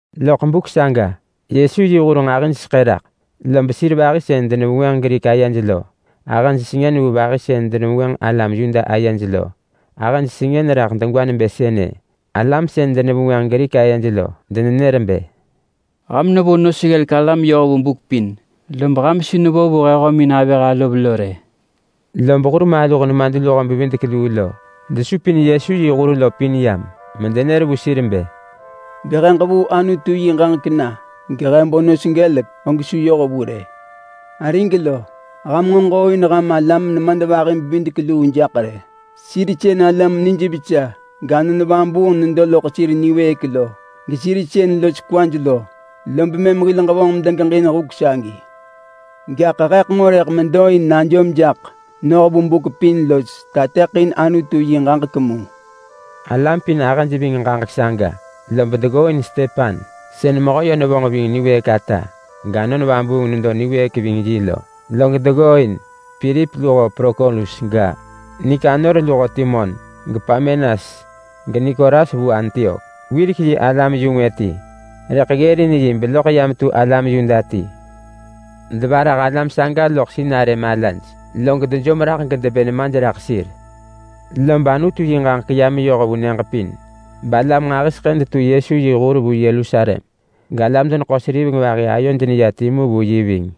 Nahub geYesu yi hur nġahiseḳë raḳ, lob sir vahi sën denevengwënġ Grik ayej lo ahëj sengën vu vahi sën denevengwënġ alam Yuda ayej lo. Ahëj sengën raḳ degwa nebë sënë: Alam sën denevengwënġ Grik ayej lo denenër bë, “Ham nevo nos ggelek alam yoh vu buk pin log ham su nevo vu he hömin avëh alov lo rë.” Lob hurmaluh nemadluho-bevidek-luu muġinsën desupin Yesu yi hur lo pin yam medenër vu sir bë, “Bë he ġevuu Anutu yi ġaġek na gehe bo nos gelek, og su yoh vu rë! Arig lo! Ham nġo ġooin ham alam nemadvahi-bevidek-luu jaḳ rë. Sir sën alam nijvesa gAnon Vabuung nedo loḳ sir niwëëk lo, gesir sën los kwaj lo. Lob mëm hil ġevonġ medegeġin huk sagi. Gaḳ heḳ nġo rëḳ medo in najom jaḳ noh vu buk pin los tateḳin Anutu yi ġaġek mu.” Alam pin ahëj ving ġaġek saga, lob deggooin Stepan, sën mehö yö nevonġ ving niwëëk ata gAnon Vabuung nedo niwëëk ving yi lo. Log deggooin Pilip luho Prokorus ga, Nikanor luho Timon, geParmenas, geNikolas vu Antiok. Wirek yi alam-yu-ngwë ti rëḳ ggërin yi beloḳ ya metu alam Yuda ti. Devarah alam saga loḳ sinarë malaj, log dejom raḳ gedebë nemaj raḳ sir. Log Anutu yi ġaġek ya meyoh vu nyëġ pin, balam nġahiseḳë detu Yesu yi hur vu Yerusalem. Galam-deneḳo-seriveng vahi ayoj neya timu vu yi ving.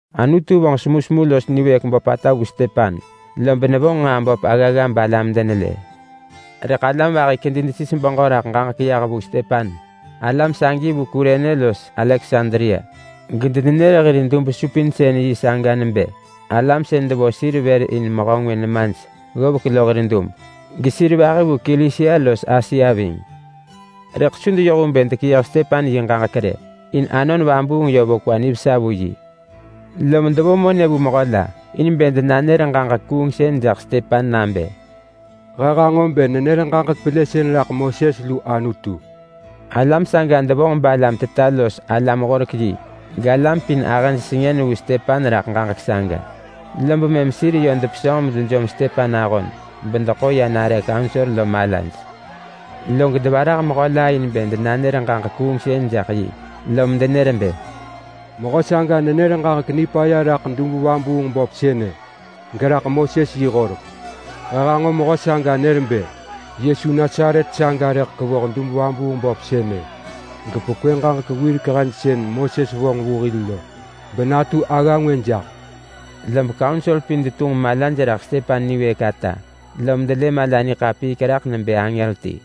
Anutu vonġ semusemu los niwëëk böpata vu Stepan, lob nevonġ nġaa böp aggagga balam denelë. Rëḳ alam vahi kedi desis beġö raḳ ġaġek yah vu Stepan. Alam sagi vu Kurene los Aleksandria, gedenenër hir dub-supinsën-yi saga nebë alam sën devo sir vër in mehö ngwë nemaj ggovek lo hir hir. Gesir vahi vu Kilisia los Asia ving. Rëḳ su deyoh vu bë dekeyëh Stepan yi ġaġek rë, in Anon Vabuung yö vo kwa nivesa vu yi. Lom devo monë vu mehö la in bë denanër ġaġek kuungsën jaḳ Stepan nabë, “He hanġo bë nenër ġaġek pelësën raḳ Moses lu Anutu!” Alam saga devonġ balam teta los alam-horek-yi galam pin ahëj sengën vu raḳ saga, lob mëm sir yö depesönġ medejom Stepan ahon bedeḳo ya nare kaunsor mala. Log devarah mehö la in bë denanër ġaġek kuungsën jaḳ yi lom denër bë, “Mehö saga nenër ġaġek nipaya raḳ dub-vabuung-böp sënë, geraḳ Moses yi horek. He hanġo mehö saga nër bë, ‘Yesu Nasaret saga rëḳ kevoh dub-vabuung-böp sënë gepekwë ġaġek wirek hen sën Moses vonġ vu hil lo benatu agga ngwë jaḳ.’” Lob kaunsor pin detunġ malaj raḳ Stepan niwëëk ata, lom delë mala niḳapiik raḳ nebë angër ti.